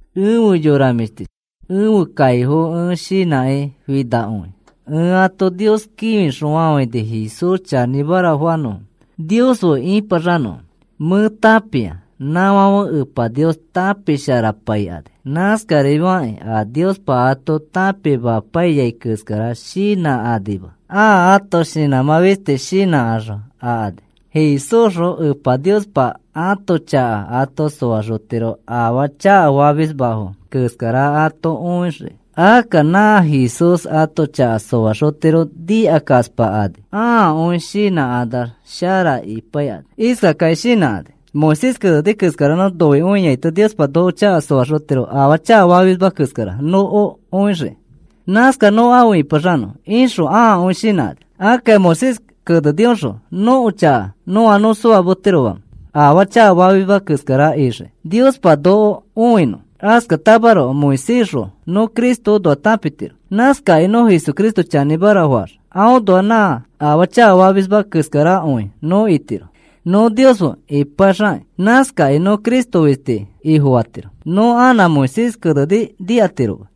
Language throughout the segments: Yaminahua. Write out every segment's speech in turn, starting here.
Efe yora mĩshtichi, ẽfe kaifo ẽ shinãkĩ finakõi. Ẽ ato Nios kĩfixõfafãini Jesús chanĩmara fanõfo, Nios fe ĩpaxanõfo. Mẽ tãpia nãfãfe Epa Nios tãpisharapaikani. Nãskafikakĩ a Niospa ato tãpimapaiyai keskara shinãkanima. Ãa ãto shinãmã fisti shinãxõ akani. Jesúsxõ Epa Niospa ãto chaka ato soaxotiro afaa chakafamisfoma keskara ato õixiki. Akka nã Jesús ato chaka soaxotiro nikakaspakani. Ãakõi shinãkanax shara ipaikani. Iskakakĩ shinãkani: “Moisés keneni keskara nõ nikakõiaito Niospa noko chaka soaxotiro afaa chakafamisma keskara noko õixiki. Nãskax nõ afe ĩpaxanõ,” ixõ ãakõi shinãkani. Akka Moisés kenenioxõ nõko chaka nõa nõ soametiroma afaa chakafamisma keskara ixii Niospa noko õinõ. Askatamaroko Moisésxõ nõ Cristoõnoa tãpitiro. Nãskakĩ nõ Jesucristo chanĩmara faax aõnoax nã afaa chakafamisma keskarakõi nõ itiro nõ Nios fe ipaxakĩ. Nãskakĩ nõ Cristo fisti Ifofatiro. Nõ anã Moisés keneni nikatiroma.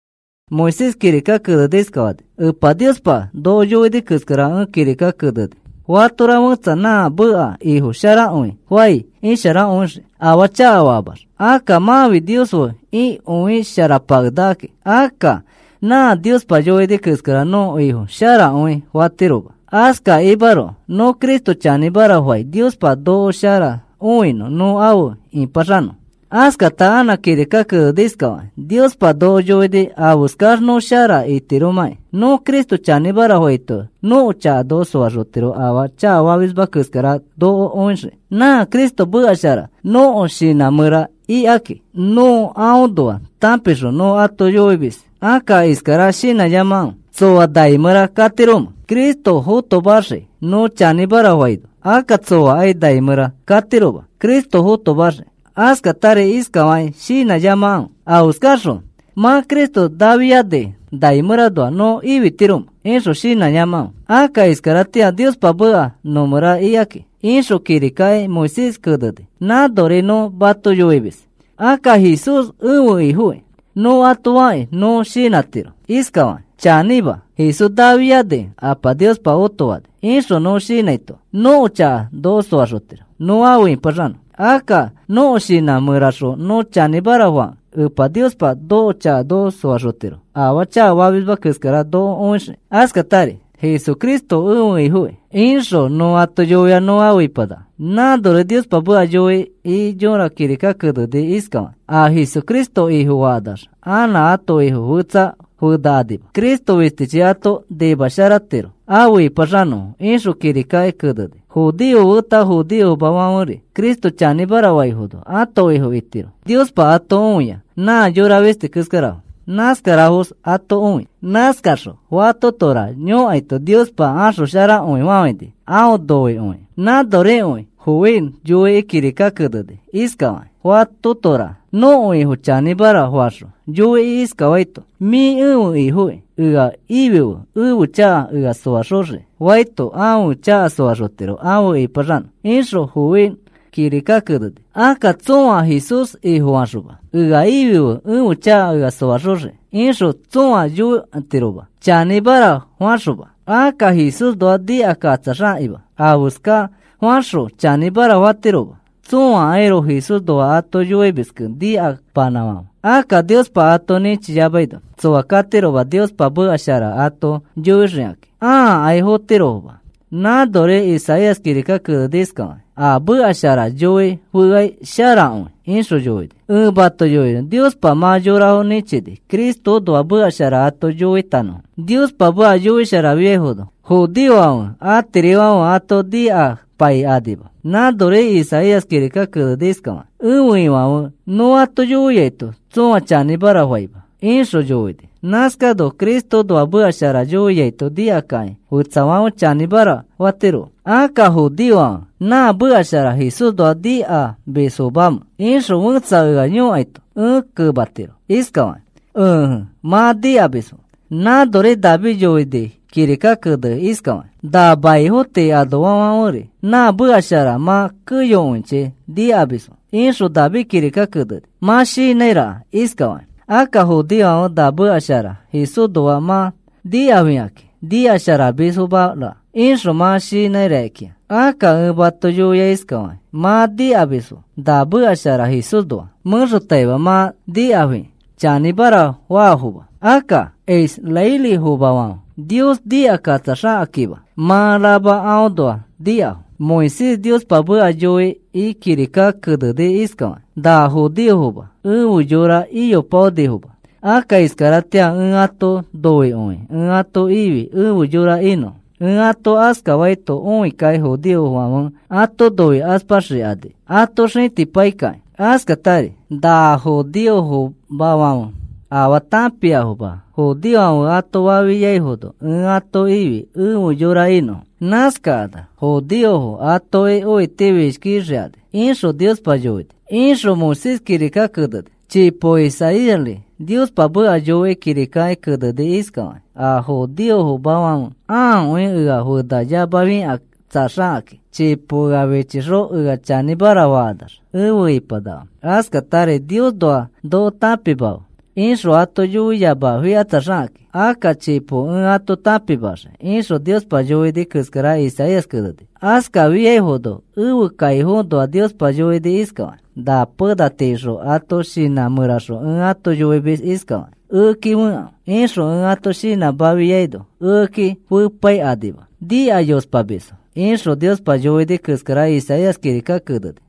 Moisés kirika kenekĩ iskafani: “Epa Niospa noko yoini keskara ẽ kirika keneni. Fatora fẽtsa nã meka ifo sharakõi fai isharakõixii, afaa chakafaamax. Akka mãfi Nios fe ikõisharapakenakaki. Akka nã Niospa yoini keskara nõ ifo sharakõi fatiroma. Askakimaroko nõ Cristo chanĩmara fai Niospa noko shara õinõ, nõ afe ĩpaxanõ.” Askata anã kirika kenekĩ iskafani: “Niospa noko yoini afeskax nõ shara itiromãkĩ. Nõ Cristo chanĩmara faito nõko chaka noko soaxotiro afaa chakafamisma keskara noko õixiki. Nã Cristo meka shara nõko shinã mẽra ikakĩ. Nõ aõnoa tãpixõ nõ ato yoimis. Akka iskara shinãyamakãfe: ‘¿Tsoa nai mẽra katiromẽ Cristo fotomaxiki nõ chanĩmara fanõ?’ Akka tsoakai nai mẽra katiroma Cristo fotomaxiki. Askatari iskafakĩ shinãyamakãfe: ‘¿Afeskaxõ mã Cristo naafianikẽ mai mẽranoa nõ ifitiromẽ?’ ixõ shinãyamakãfe. Akka iskaratĩa Niospa meka nõ mẽra ikakĩ,” ixõ kirikaki Moisés keneni. Nãnori nõ mato yoimis. Akka, “Jesús ẽfe Ifoki,” nõ ato fakĩ nõ shinãtiro iskafakĩ: “Chanĩma, Jesús nafianikẽ Apa Niospa otofani,” ixõ nõ shinãito nõko chaka noko soaxotiro nõ afe ĩpaxanõ. Akka nõko shinã mẽraxõ nõ chanĩmara fakẽ Epa Niospa nõko chaka noko soaxotiro afaa chakafamisma keskara noko õixiki. Askatari, “Jesucristo ẽfe Ifoki,” ixõ nõ ato yoiax nõ afe ipanaka. Nãnori Niospa meka yoikĩ yõra kirika keneni iskafakĩ: “A Jesucristo Ifofakanax anã ãto ifo fetsa fenakanima. Cristo fistichi ato nimasharatiro afe ĩpaxanõfo,” ixõ kirikaki keneni. Judeofo feta judeofomafãferi Cristo chanĩmara faifono ãto Ifo itiro. Niospa ato õia nã yora fisti keskarafo, nãskarafos ato õi. Nãskaxõ fatotora yõkaito Niospa axosharakõifafãini aõ noikõikĩ. Nãnorikõi Joel yoikĩ kirika keneni iskafakĩ: “Fatotora nõko Ifo chanĩmara faxõ yoikĩ iskafaito: ‘Mĩ ẽfe Ifoki, ea ifife ẽfe chaka ea soaxoxiki,’ faito ãfe chaka soaxotiro afe ĩpaxanõ,” ixõ Joel kirika keneni. Akka tsõa Jesús Ifofaxoma, “Ea ifife ẽfe chaka ea soaxoxiki,” ixõ tsõa yõkatiroma chanĩmara faxoma. Akka Jesúsnoa nikakatsaxakĩma afeska faxõ chanĩmara fatirofoma. Tsõakairoko Jesúsnoa ato yoimiskẽ nikapanãfãfe. Akka Niospa ato nĩchiyamaino tsoa katiroma Niospa meka shara ato yoixikakĩ. Ãkai fotirofoma. Nãnori Isaías kirika keneni iskafakĩ: “A meka shara yoi feai sharakõi,” ixõ yoini. Ẽ mato yoinõ Niospa mã yorafo nĩchini Cristoõnoa meka shara ato yoitanõfo. Niospa meka yoisharafiaifono judeofo atirifãfe ato nikapaikanima. Nãnori Isaías kirika keneni iskafakĩ: “Ẽfe Ifãfe, nõ ato yoiaito tsõa chanĩmara faima,” ixõ yoini. Nãskano Cristoõnoa meka shara yoiaito nikakakĩ fetsafãfe chanĩmara fatirofo. “Akka, ¿judeofãfe nã meka shara Jesúsnoa nikamisfomamẽ?” ixõ fẽtsa ea yõkaito, ẽ kematiro iskafakĩ: “Ẽje, mã nikamisfo.” Nãnori David yoini kirika kenekĩ iskafakĩ: Nã maifo tii anoafãferi nã meka shara mã keyokõichi nikamisfo, ixõ David kirika keneni. Mã shinãiraka iskafakĩ: “Akka judeofãfe na meka shara Jesúsnoa mã nikafikakĩ nikasharamisfomara,” ixõ mã shinãi rakikĩa. Akka ẽ mato yoi iskafakĩ, mã nikamisfo nã meka shara Jesúsnoa. Mẽxotaima mã nikafikakĩ chanĩmara faafoma. Akka israelifomafãfe Nios nikakatsaxakakĩma mã rama aõnoa nikafo. Moisés Niospa meka yoikĩ kirika keneni iskafakĩ: Nã judeofoma efe yora iyopaonifoma. Akka iskaratĩa ẽ ato noikõikĩ ẽ ato ifi efe yora inõfo. Ẽ ato askafaito õikakĩ judeofãfe ato noikaspaxikani ato xĩtipaikakĩ. Askatari, “Na judeofomafãfe afaa tãpiafoma, judeofãfe ato fafiaifono ẽ ato ifi efe yora inõfo. Nãskakanax judeofo atoki õitifishkixikani,” ixõ Niospa yoini, ixõ Moisés kirika keneni. Chipo Isaíasri Niospa meka yoikĩ kirikaki keneni iskafakĩ: A judeofomafãfe akõi ea fenayamafikatsaxakakĩ chipo ea fichixõ ea chanĩmara fakanax efe ipanakafo. Askatari, “Niosnoa noko tãpimafe,” ixõ ato yoiyamafikatsaxakakĩ. Akka chipo ẽ ato tãpimaxii, ixõ Niospa yoini keskara Isaías keneni. Askafiaifono ẽfe kaifoõnoa Niospa yoini iskafakĩ: “Nã pena tiixõ ãto shinã mẽraxõ ẽ ato yoimis iskafakĩ: ‘Ekeki fekãfe,’ ixõ ẽ ato shinãmafiaino ekeki fepaikanima. Nikayospamisfo,” ixõ Niospa yoini keskara Isaías kirika keneni.